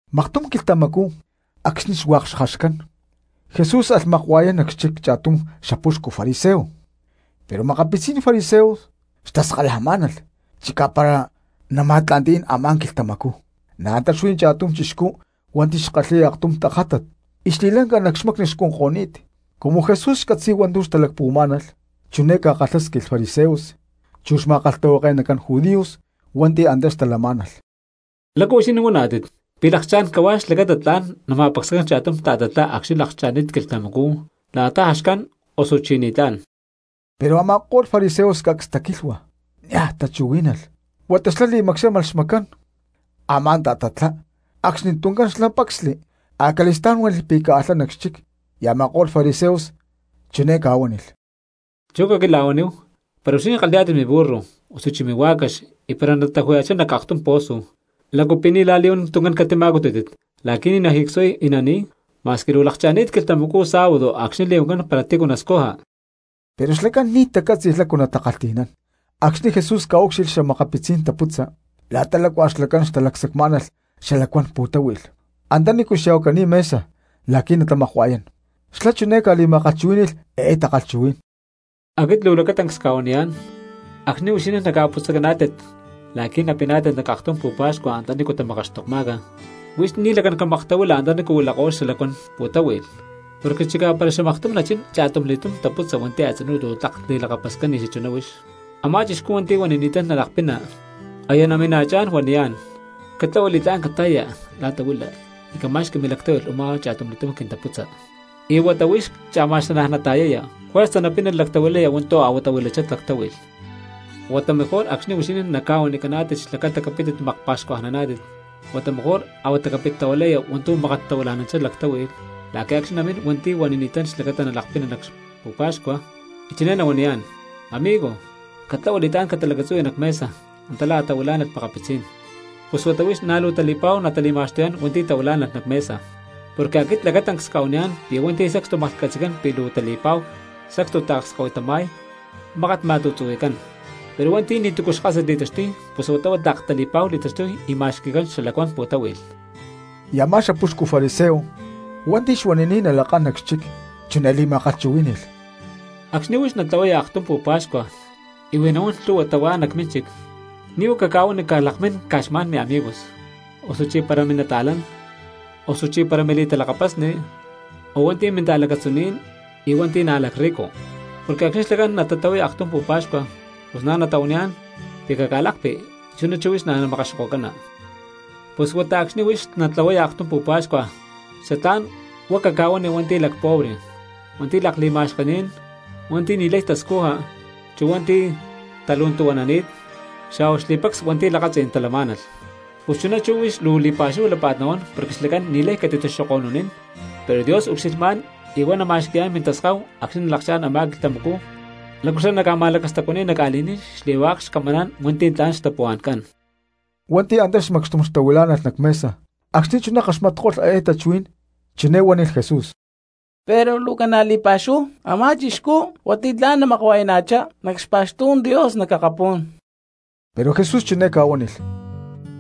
Maktum quilhtamacú acxni̠ hua̠k xjaxcán Jesús alh makua̠yán nac xchic cha̠tum xapuxcu fariseo; pero makapitzí̠n fariseos xtaskalajmá̠nalh chicá para nama̠tla̠nti̠nán a̠má quilhtamacú. Na̠ antá xuí cha̠tum chixcú hua̠nti̠ xkalhi̠y aktum tajátat y xli̠lanca nac xmacni xcunko̠ni̠t. Cumu Jesús xcatzi̠y hua̠ntu̠ xlacán xtalacpuhuamá̠nalh chiné ca̠kalhásquilh fariseos chu xma̠kalhtahuake̠nacán judíos hua̠nti̠ antá xtalamá̠nalh: —¿Lácu huixinín huaná̠tit, pi̠ lakchá̠n cahuá xlacata tla̠n nama̠pacsacán cha̠tum ta̠tatlá acxni̠ lakcha̠ni̠t quilhtamacú la̠ta jaxcán, osuchí ni̠tlá̠n? Pero a̠ma̠ko̠lh fariseos cacs taquilhua niaj tachuhuí̠nalh huata xlá li̠macxámalh xmacán a̠má ta̠tatlá acxni tuncán xlá pacsli. Acali̠stá̠n huánilh pi̠ caalhá nac xchic. Y a̠ma̠ko̠lh fariseos chiné ca̠huánilh: —Chú caquila̠huaníhu, para huixinín kalhi̠yá̠tit miburro osuchí mihuá̠cax y para nataju̠ya̠chá nac aktum pozo, ¿lácu pi̠ ni̠ la̠li̠huán tuncán catima̠cutútit la̠qui̠ ni̠ najicsuay y nani̠y, ma̠squi luu lakcha̠ni̠t quilhtamacú sábado acxni̠ li̠huancán para tícu nascuja? Pero xlacán ni̠ tacátzi̠lh lácu natakalhti̠nán. Acxni̠ Jesús ca̠úcxilhli xa̠makapitzí̠n taputza la̠ta lácua xlacán xtalacsacmá̠nalh xalacuán pu̠táhui̠lh antanícu xya̠huacani̠t mesa la̠qui̠ natamakua̠yán, xlá chiné ca̠li̠ma̠kalhchuhuí̠ni̠lh eé takalhchuhuí̠n: —Aquit luu lacatancs cca̠huaniyá̠n, acxni̠ huixinín naca̠putzacaná̠tit la̠qui̠ napiná̠tit nac aktum pu̠pa̠xcua antanícu tamakaxtokma̠ca, huix ni̠ lacán camaktahuila antanícu huilako̠lh xalacuán pu̠táhui̠lh, porque chicá para xamaktum nachín cha̠tumli̠túm taputza hua̠nti̠ a̠tzinú luu tlak li̠lakapascán ni̠ xachuná huix. Amá chixcú hua̠nti̠ huanini̠tán nalakpina, aya namina̠chá̠n huaniyá̠n: “Catlahua li̠tlá̠n cata̠ya la̠ta huila y cama̠xqui milactáhui̠lh u̠má cha̠tumli̠túm quintaputza.” Y huata huix cha̠ma̠xanaj nata̠yaya, juerza napina lactahuilaya hua̠ntu̠ a̠huatá huilachá lactáhui̠lh. Huata mejor acxni̠ huixinín naca̠huanicaná̠tit xlacata capítit makpa̠xcuajnaná̠tit, huata mejor a̠huata capit tahuilaya hua̠ntu̠ mákat tahuila̠nanchá lactáhui̠lh la̠qui̠ acxni̠ namín hua̠nti̠ huanini̠tán xlacata nalakpina nac pu̠pa̠xcua, y chiné nahuaniyá̠n: “Amigo, catlahua li̠tlá̠n catalacatzuhui nac mesa antá la̠ a̠tahuilá̠nalh makapitzí̠n.” Pus huata huix na̠ luu tali̠pa̠hu natali̠ma̠xtuyá̠n hua̠nti̠ tahuilá̠nalh nac mesa. Porque aquit lacatancs cca̠huaniyá̠n pi̠ hua̠nti̠ sacstu maklhcatzi̠cán pi̠ luu tali̠pa̠hu sacstu taakskahuitama̠y mákat ma̠tu̠tzuhui̠cán; pero hua̠nti̠ ni̠tu̠cu xkásat li̠taxtuy pus huata huá tlak tali̠pa̠hu li̠taxtuy y ma̠xqui̠cán xalacuán pu̠táhui̠lh. Y a̠má xapuxcu fariseo hua̠nti̠ xuanini̠t nalakán nac xchic chiné li̠ma̠kalhchuhuí̠ni̠lh: —Acxni̠ huix natlahuaya aktum pu̠pa̠xcua y huij nahuán lhu̠hua tahuá nac mínchic, ni̠ huá caca̠huani catalakmín caj xma̠n miamigos, osu para minata̠lán, osuchí para mili̠talakapasni, o hua̠nti̠ minta̠lacatzuní̠n y hua̠nti̠ na̠ lacrrico; porque acxni̠ xlacán natatlahuay aktum pu̠pa̠xcua pus na̠ natahuaniyá̠n pi̠ caca̠lakpi y chuná chú huix namakaxokocana. Pus huata acxni̠ huix natlahuaya aktum pu̠pa̠xcua xatlá̠n huá caca̠huani hua̠nti̠ lacpobre, hua̠nti̠ lakli̠ma̠xkení̠n, hua̠nti̠ ni̠lay tascuja, chu hua̠nti̠ talu̠ntu̠huanani̠t, xa̠hua xli̠pacs hua̠nti̠ lakatzí̠n talamá̠nalh. Pus chuná chú huix luu li̠pa̠xúhu lápa̠t nahuán porque xlacán ni̠lay catitaxoko̠nunín, pero Dios ucxilhmá̠n y huá nama̠xqui̠yá̠n mintaskahu acxni̠ nalakchá̠n a̠má quilhtamacú lácu xlá naca̠ma̠lacastacuani̠y nac ca̠li̠ní̠n xli̠hua̠k xcamaná̠n hua̠nti̠ tla̠n xtapuhua̠ncán. Cha̠tum chixcú hua̠nti̠ antá macxtum xtahuilá̠nalh nac mesa acxni̠ chuná kaxmatko̠lh eé tachuhuí̠n chiné huánilh Jesús: —Pero luu ca̠na li̠pa̠xúhu a̠má chixcú hua̠nti̠ tla̠n namakua̠yana̠chá̠n nac xpa̠xtú̠n Dios nac akapú̠n. Pero Jesús chiné ca̠huánilh: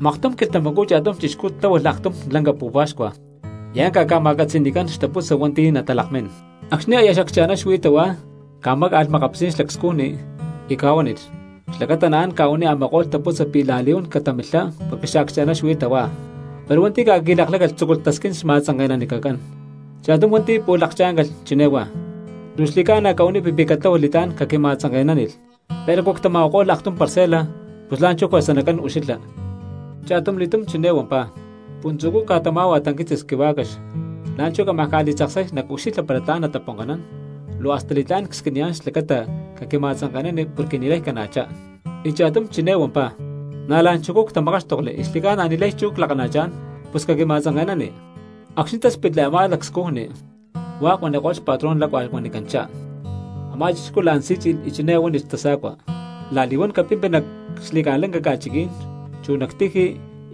—Maktum quilhtamacú cha̠tum chixcú tláhualh aktum lanca pu̠pa̠xcua y ánca ca̠ma̠catzi̠ni̠cán xtaputza hua̠nti̠ natalakmín. Acxni̠ aya accha̠ná xuí tahuá ca̠máca̠lh makapitzí̠n xlacscujni y ca̠huánilh xlacata naán ca̠huaniy a̠ma̠ko̠lh taputza pi̠ la̠li̠huán catamilhá porque xaaccha̠ná xuí tahuá. Pero hua̠nti̠ ca̠qui̠lakláca̠lh tzúculh tasquín xma̠tzanke̠nanicacán. Cha̠tum hua̠nti̠ pu̠lh lakchá̠ncalh chiné huá: “Luu xli̠ca̠na cahuanipi pi̠ catláhualh li̠tlá̠n caquima̠tzanke̠nánilh, pero a̠cu ctama̠huako̠lh aktum parcela, pus la̠nchú juerza nacán ucxilha.” Cha̠tumli̠túm chiné huampá: “Puntzu̠cú cca̠tamá̠hua tanquitzis quihuá̠cax, la̠nchú cámaj ca̠li̠tzaksay nacucxilha para tla̠n taponka̠nán; luu hasta li̠tlá̠n csquiniyá̠n xlacata caquima̠tzanke̠nani porque ni̠lay cana̠chá.” Y cha̠tum chi̠né huampá: “Na̠ la̠nchujcú ctamakáxtokli y xli̠ca̠na ni̠lay chú clakana̠chá̠n, pus caquima̠tzanke̠nani.” Acxni̠ táspitli a̠má lacscujni hua̠k huaniko̠lh xpatrón lácua huanicanchá. Amá chixcú la̠n sí̠tzi̠lh y chiné huánilh xtasa̠cua: “La̠li̠huán capimpi nac xli̠ca̠lanca ca̠chiquí̠n, chu nac tiji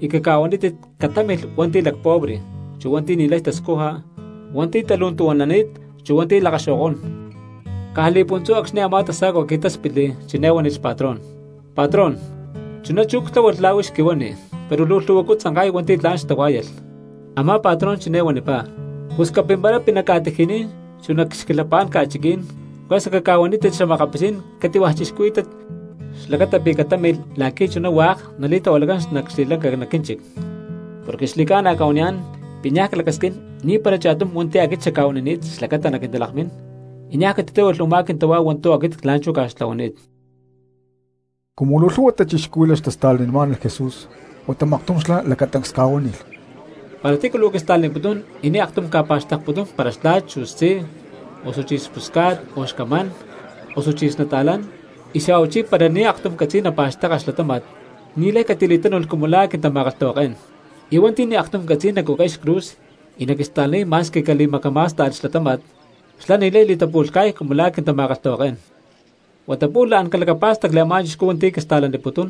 y caca̠huanítit catámilh hua̠nti̠ lacpobre, chu hua̠nti̠ ni̠lay tascuja, hua̠nti̠ talu̠ntu̠huanani̠t, chu hua̠nti̠ lakaxo̠kó̠n.” Caj li̠puntzú acxni̠ a̠má tasa̠cua qui̠táspitli, chiné huánilh xpatrón: “Patrón, chuná chú ctláhualh la̠ huix quihuani, pero luu lhu̠huacú tzanka̠y hua̠nti̠ tla̠n xtahuá̠yalh.” Amá patrón chiné huanipá: “Pus capimparapi nac ca̠tiji̠ní̠n chu nac xquilhapá̠n ca̠chiquí̠n, juerza caca̠huanítit xa̠makapitzí̠n cati̠hua̠ cristianos xlacata pi̠ catámilh láqui̠ chuná hua̠k nalatahuilako̠cán nac xli̠ca̠lanca nac quínchic. Porque xli̠ca̠na cca̠huaniyá̠n pi̠ niaj clacasquín ni̠para cha̠tum hua̠nti̠ aquit xacca̠huanini̠t xlacata naquintalakmín, y niaj catitáhualh u̠má quintahuá hua̠ntu̠ aquit la̠nchú cca̠xtlahuani̠t.” Cumu luu lhu̠hua cristianos xtasta̠lanimá̠nalh Jesús huata maktum xlá lacatancs ca̠huánilh: —Para tícu luu quista̠laniputún y ni̠ aktum ca̠pa̠xtekputún para xtla̠t chu xtzí, osuchí xpusca̠t, o xcamán, osuchí xnata̠lán, y xa̠huachí para ni̠ aktum catzi̠y napa̠xteka xlatáma̠t, ni̠lay catili̠tánu̠lh cumu la̠ quintama̠kalhtahuaké̠n. Y hua̠nti̠ ni̠ aktum catzi̠y nacucay xcruz y naquista̠laniy ma̠squi cali̠macamá̠sta̠lh xlatáma̠t, xlá ni̠lay li̠tapu̠lhca̠y cumu la̠ quintama̠kalhtahuaké̠n. Huata pu̠lh la̠n calacapá̠stacli a̠má cristiano hua̠nti̠ quista̠laniputún,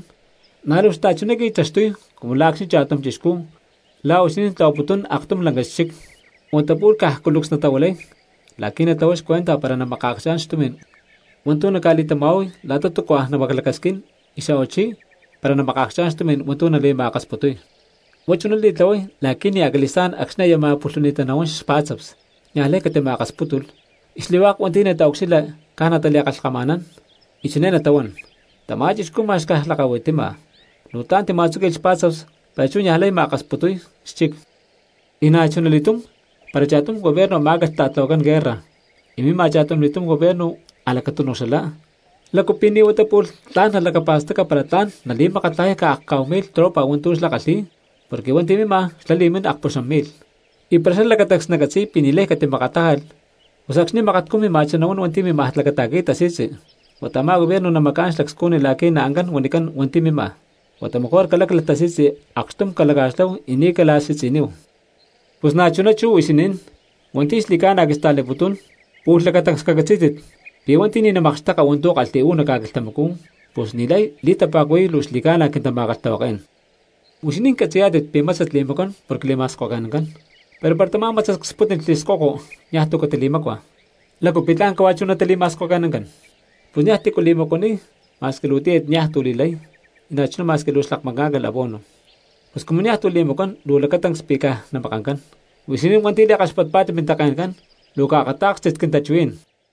na̠ luu xta̠chuná qui̠taxtuy cumu la̠ acxni̠ cha̠tum chixcú la̠ huixinín tlahuaputún aktum lanca xchic, huata pu̠lh caj cúlucs natahuilay la̠qui̠ natlahuay xcuenta para namakaacchá̠n xtumí̠n hua̠ntu̠ naca̠li̠tama̠huay la̠ta túcua namaclacasquín y xa̠huachí para na̠ namakaacchá̠n xtumi̠n hua̠ntu̠ nali̠ma̠akasputuy. Huá chuná li̠tlahuay la̠qui̠ ni̠ acali̠stá̠n acxni̠ aya ma̠pulhuni̠ttá nahuán xpá̠tzaps niaj lay catima̠akaspútulh, y xli̠hua̠k hua̠nti̠ nataucxilha caj natali̠kalhkama̠nán, y chiné natahuán: “Tamá chixcú ma̠x caj lakahuitima, luu tla̠n tima̠tzúqui̠lh xpá̠tzaps pero chú niaj lay ma̠akasputuy xchic.” Y na̠chuna li̠túm para cha̠tum gobierno amá̠calh ta̠tlahuacán guerra y mima cha̠tumli̠túm gobierno a̠lacatúnuj xalá, ¿lácu pi̠ ni̠ huata pu̠lh tla̠n nalacapa̠staca para tla̠n nali̠makatlajay caj akcá̠hu mi̠lh tropa hua̠ntu̠ xlá kalhi̠y, porque hua̠nti̠ mima xlá li̠mín akpuxam mi̠lh? Y para xlá lacatancs nacatzi̠y pi̠ ni̠lay catimakatlájalh, pus acxni̠ makatcú mima̠chá nahuán hua̠nti̠ mímaj lacata̠qui̠y tasi̠tzi, huata a̠má gobierno naca̠macá̠n xlacscujni la̠qui̠ naancán huanicán hua̠nti̠ mima: “Huata mejor caláclalh tasi̠tzi acxtum calaca̠xláhu y ni̠ cala̠si̠tzi̠níhu.” Pus na̠chuná chú huixinín hua̠nti̠ xli̠ca̠na quista̠laniputún, pu̠lh lacatancs cacatzí̠tit pi̠ hua̠nti̠ ni̠ namakxteka hua̠ntu̠ kalhi̠y uú nac ca̠quilhtamacú pus ni̠lay li̠tapa̠cuhui̠y luu xli̠ca̠na quintama̠kalhtahuaké̠n. ’Huixinín catzi̠yá̠tit pi̠ mátzat li̠macuán porque li̠ma̠skoke̠nancán, pero para tamá mátzat cspútnilh xli̠skoko niaj tu̠ catili̠mácua, ¿lácu pi̠ tla̠n cahuá chú natili̠ma̠skoke̠nancán? Pus niaj tícu li̠macuaniy ma̠squi luu tíyat niaj tu̠ li̠lay, y na̠chuná ma̠squi luu xlakmacá̠ncalh abono. Pus cumu niaj tu̠ li̠macuán luu lacatancs pi̠ caj namakancán. ¡Huixinín hua̠nti̠ li̠kaxpatpá̠tit mintake̠ncán, luu caakatá̠kstit quintachuhuí̠n!